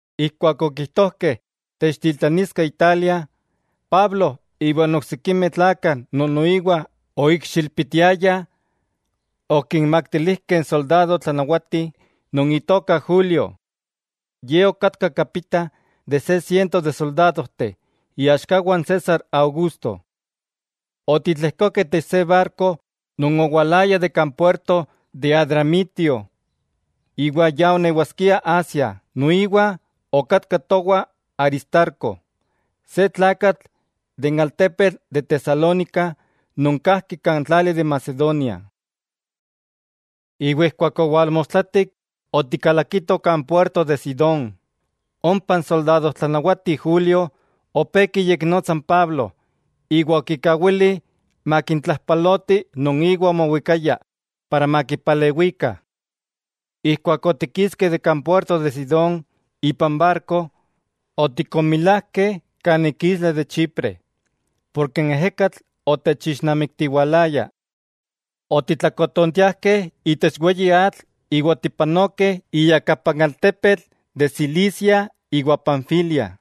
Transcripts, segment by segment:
Ijkuak okijtojkeh techtitlaniskeh Italia, Pablo iwa n oksikimeh tlakah non noiwa oikxilpitiayah, okinmaktilijkeh n soldado tlanawati non itoka Julio. Ye okatka kapita de se siento de soldadojteh iaxkawah n César Augusto. Otitlejkokeh itech se barko non owalaya de kan puerto de Adramitio iwa ya onewaskia Asia. Noiwa okatka towah Aristarco, se tlakatl de Tesalónica non kajki kan tlali de Macedonia. Iwa ijkuak owalmostlatik otikalakitoh kan puerto de Sidón; ompa n soldadojtlanawati Julio opé kiyeknotsa n Pablo iwa okikawili makintlajpaloti non iwa omowikaya para makipalewikah. Ijkuak otikiskeh de kan puerto de Sidón ipan barko, otikonmilajkeh kan ik isla de Chipre, porke n ejekatl otechixnamiktiwalaya. Otitlakotontiajkeh itech weyi atl iwa otipanokeh iyakapa n altepetl de Cilicia iwa Panfilia.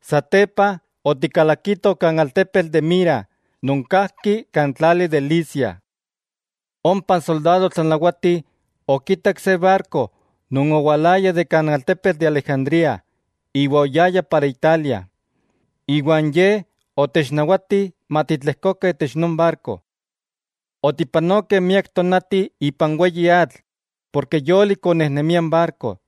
Satepa otikalakitoh kan altepetl de Mira non kajki kan tlali de Licia. Ompa n soldado tlanawati okitak se barko non owalaya de kan altepetl de Alejandría iwa oyaya para Italia, iwa n ye otechnawati matitlejkokah itech non barko. Otipanokeh miak tonati ipan weyi atl porke yolik onejnemia n barko,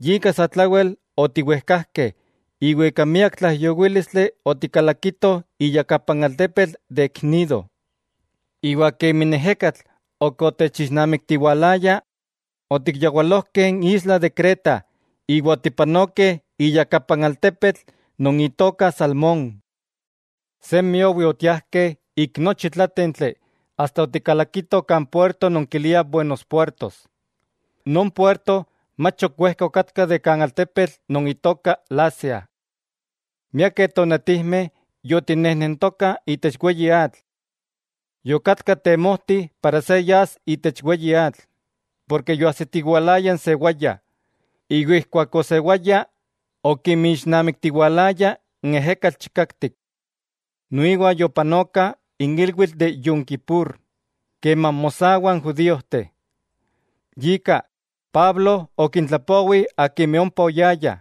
yika satlawel otiwejkajkeh iwa ika miak tlaijyowílistli otikalakitoh iyakapa n altepetl de Gnido. Iwa kemi n ejekatl ok otechixnamiktiwalaya, otikyawalojkeh n isla de Creta iwa otipanokeh iyakapa n altepetl non itoka Salmón. Semi owi otiajkeh ik nochi tlátentli asta otikalakitoh kan puerto non kiliah Buenos Puertos. Non puerto mach ok wejka okatka de kan altepetl non itoka Lasea. Miakeh tonatijmeh yotinejnentokah itech weyi atl. Yokatka temojti para se yas itech weyi atl, ken yoajsitiwalaya n sewaya, iwa ijkuak osewaya okinmixnamiktiwalaya n ejekatl chikaktik. Noiwa yopanoka n ilwitl de Yom Kippur keman mosawah n judíojteh. Yika, Pablo okintlapowi akimeh ompa oyayah,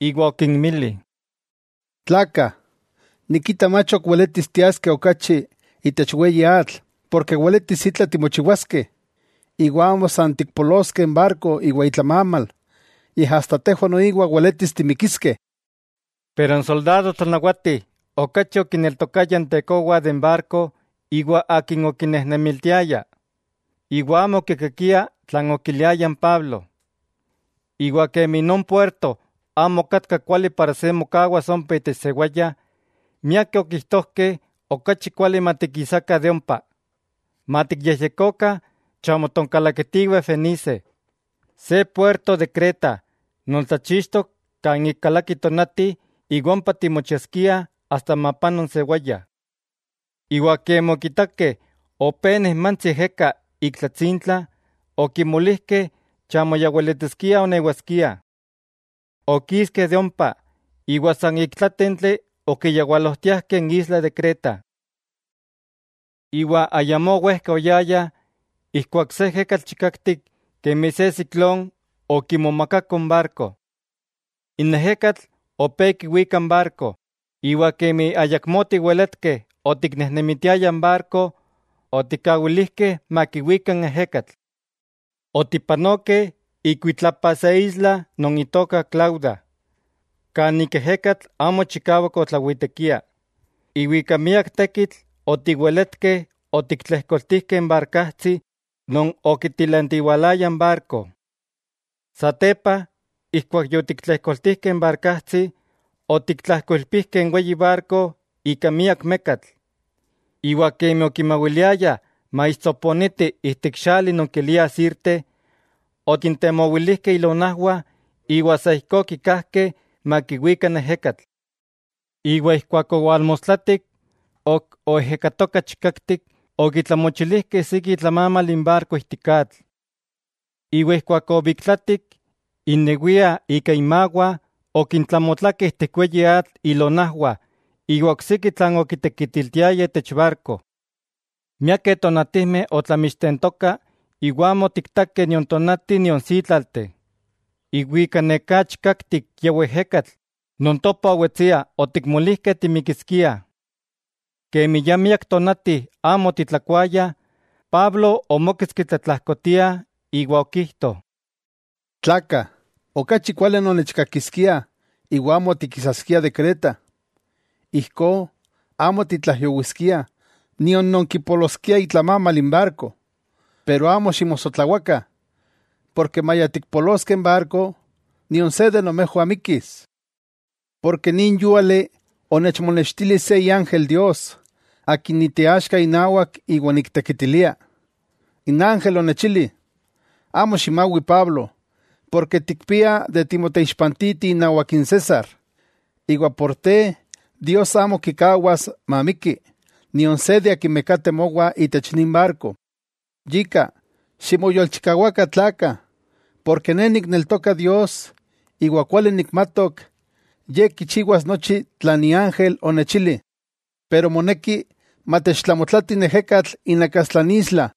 iwa okinmili: —Tlakah, nikita mach ok weletis tiaskeh okachi itech weyi atl porke weletis itla timochiwaskeh. Iwa amo san tikpoloskeh n barko iwa itlamamal, yej asta tejwah noiwa weletis timikiskeh. Pero n soldado tlanawati okachi okineltokaya n tekowa de n barko iwa akin okinejnemitiaya, iwa amo okikakia tlan okiliaya n Pablo. Iwa kemi non puerto amo okatka kuali para se mokawas ompa itech sewaya, miakeh okijtojkeh okachi kuali matikisakah de ompa. Matikyejyekokah chamo tonkalakitiweh Fenice, se puerto de Creta non tlachixtok kan ik kalaki tonati iwa ompa timochiaskiah asta mapano n sewaya. Iwa kemi okitakeh opé nejmantsi ejeka ik tlatsintla, okimolijkeh chamo ya weletiskia onewaskiah. Okiskeh de ompa, iwa san ik tlátentli okiyawalojtiajkeh n isla de Creta. Iwa ayamó wejka oyayah ijkuak se ejekatl chikaktik kemi se siklón okimomakako n barko. N ejekatl opé kiwika n barko. Iwa kemi ayakmó otiweletkeh otiknejnemitiayah n barko, otikkawilijkeh makiwika n ejekatl. Otipanokeh ikuitlapa se isla non itoka Clauda, kan ik ejekatl amo chikawak otlawitekia, iwa ika miak tekitl otiweletkeh otiktlejkoltijkeh n barkajtsi non okitilantiwalaya n barko. Satepa ijkuak yokitlejkoltijkeh n barkajtsi, okitlajkoilpijkeh n weyi barko ika miak mekatl; iwa kemi okimawiliayah maixtsoponiti ijtik xali non kiliah Sirte, okintemowilijkeh ilonajwah iwa sa ijkó okikajkeh makiwika n ejekatl. Iwa ijkuak owalmostlatik, ok oejekatoka chikaktik, okitlamochilijkeh siki itlamamal n barko ijtik atl; iwa ijkuak obiktlatik, innewiah ika inmawah okintlamotlakeh ijtik weyi atl ilonajwah iwa oksiki tlan okitekitiltiayah itech barko. Miakeh tonatijmeh otlamixtentoka iwa amo otiktakeh nion tonati nion sítlalteh, iwa ika neká chikaktik kiawiejekatl non topa owetsia otikmolijkeh timikiskiah. Kemi ya miak tonati amo otitlakuayah, Pablo omóketski tlatlajkotia iwa okijto: —Tlakah, okachi kuali nonnechkakiskiah iwa amo tikisaskiah de Creta. Ijkó amo titlaijyowiskiah nion nonkipoloskiah itlamamal n barko. Pero amo ximosotlawakah, porke maya tikpoloskeh n barko, nion se de nomejwah mikkis. Porke nin yúali onechmonextili se iángel Dios, akin niteaxka inawak iwa niktekitilia. N ángel onechili: “Amo ximawi Pablo, porke tikpia de timoteixpantiti inawak n César, iwa por te Dios amo kikawas mamikki nion se non kateh mowah itech nin barko.” Yika, ximoyolchikawakah tlakah, porke ne nikneltoka Dios, iwa kuali nikmatok Ye kichiwas nochi tlan iángel onechili. Pero moneki matechtlamotlati n ejekatl inakastla n isla.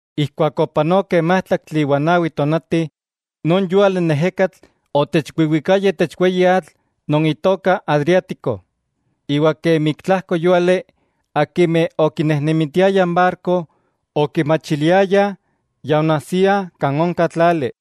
Ijkuak opanokeh májtlaktli iwa nawi tonati, non yúali n ejekatl otechwiwikaya itech weyi atl non itoka Adriático. Iwa kemi ik tlajko yúali akimeh okinejnemitiayah n barko, okimachiliayah ya onajsiah kan onka tlali.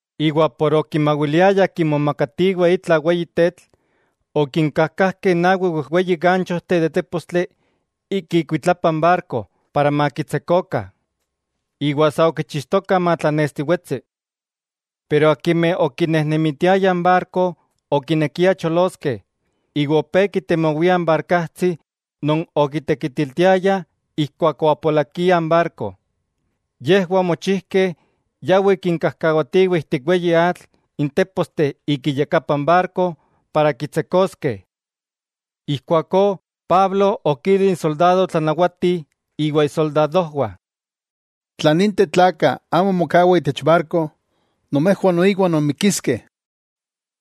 Ken okimawiliayah kimomakatiweh itla weyi tetl, okinkajkajkeh nawi wejweyi ganchojteh de tépostli ik ikuitlapa n barko para makitsekokah, iwa sa okichixtokah matlanestiwetsi. Pero akimeh okinejnemitiayah n barko okinekiah choloskeh, iwa opé kitemowiah n barkajtsi non okitekitiltiayah ijkuak oapolakia n barko. Yejwah omochijkeh yawih kinkajkawatiweh ijtik n weyi atl n téposteh ik iyakapa n barko para kitsekoskeh. Ijkuakó Pablo okili n soldado tlanawati iwa isoldadojwah: —Tla ninteh tlakah amo mokawah itech barko, nomejwah noiwa nonmikiskeh.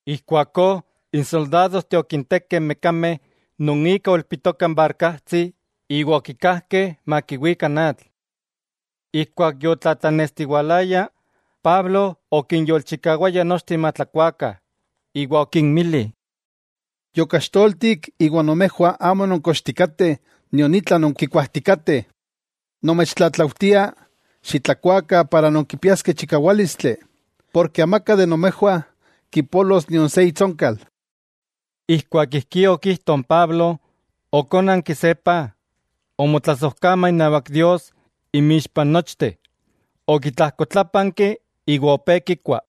Ijkuakó n soldadojteh okintekeh n mekameh non ika oilpitoka n barkajtsi iwa okikajkeh makiwika n atl. Ijkuak yotlatlanestiwalaya, Pablo okinyolchikawaya nochteh matlakuakah, iwa okinmili: —Yokaxtoltik iwa nomejwah amo nonkochtikateh nion itla nonkikuajtikateh. Nomechtlatlaujtia xitlakuakah para nonkipiaskeh chikawálistli, porke amaka de nomejwah kipolos nion se itsonkal. Ijkuak ijkí okijto n Pablo, okónanki se paj, omotlasojkama inawak Dios inmixpa n nochteh, okitlajkotlápanki iwa opé kikua.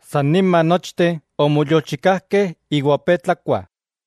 San nima nochteh omoyolchikajkeh iwa opé tlakuah.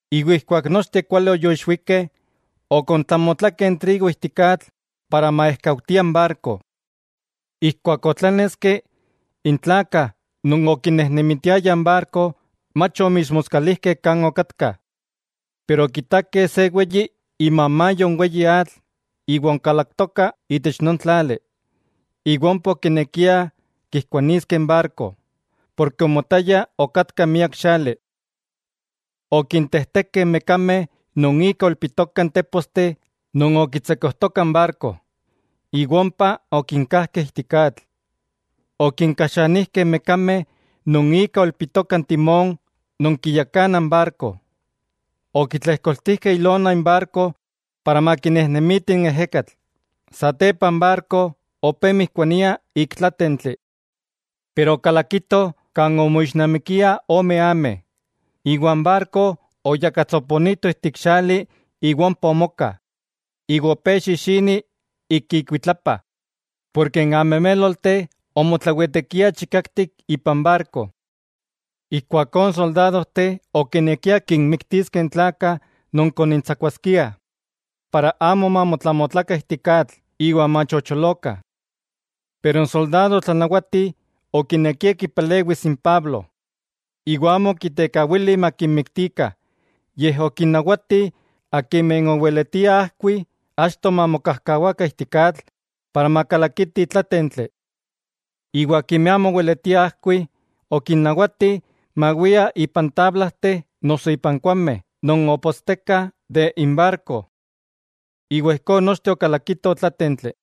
Iwa ijkuak nochteh kuali yoixwikeh, okontlamotlakeh n trigo ijtik atl para maejkautia n barko. Ijkuak otláneski, n tlakah non okinejnemitiayah n barko mach omixmoskalijkeh kan okatkah, pero okitakeh se weyi imamayo n weyi atl iwa onkalaktoka itech non tlali, iwa ompa okinekiah kijkuaniskeh n barko, porke omotaya okatka miak xali. Okintejtekeh n mekameh non ika oilpitokah n téposteh non okitsekojtokah n barko, iwa ompa okinkajkeh ijtik atl. Okinkaxanijkeh n mekameh non ika oilpitoka n timón non kiyakana n barko. Okitlejkoltijkeh ilona n barko para makinejnemiti n ejekatl, satepa n barko opé mijkuania ik tlátentli. Pero okalakito kan omoixnamikiah ome ameh, iwa n barko oyakatsoponito ijtik xali iwa ompa omoka, iwa opé xixini ik ikuitlapa, porke n amemélolteh omotlawitekiah chikaktik ipan barko. Ijkuakó n soldadojteh okinekiah kinmiktiskeh n tlakah non konintsakuaskiah, para amo mamotlamotlakah ijtik atl iwa machocholokah. Pero n soldado tlanawati okinekia kipalewis n Pablo, iwa amo okitekawili makinmiktikah, yej okinnawati akimeh oweletiah ajkuiah achto mamokajkawakah ijtik atl para makalakitih tlátentli, iwa akimeh amo oweletiah ajkuih, okinnawati mawiah ipan tablajteh noso ipan kuaujmeh non opostekah de n barko. Iwa ijkó nochteh okalakitoh tlátentli.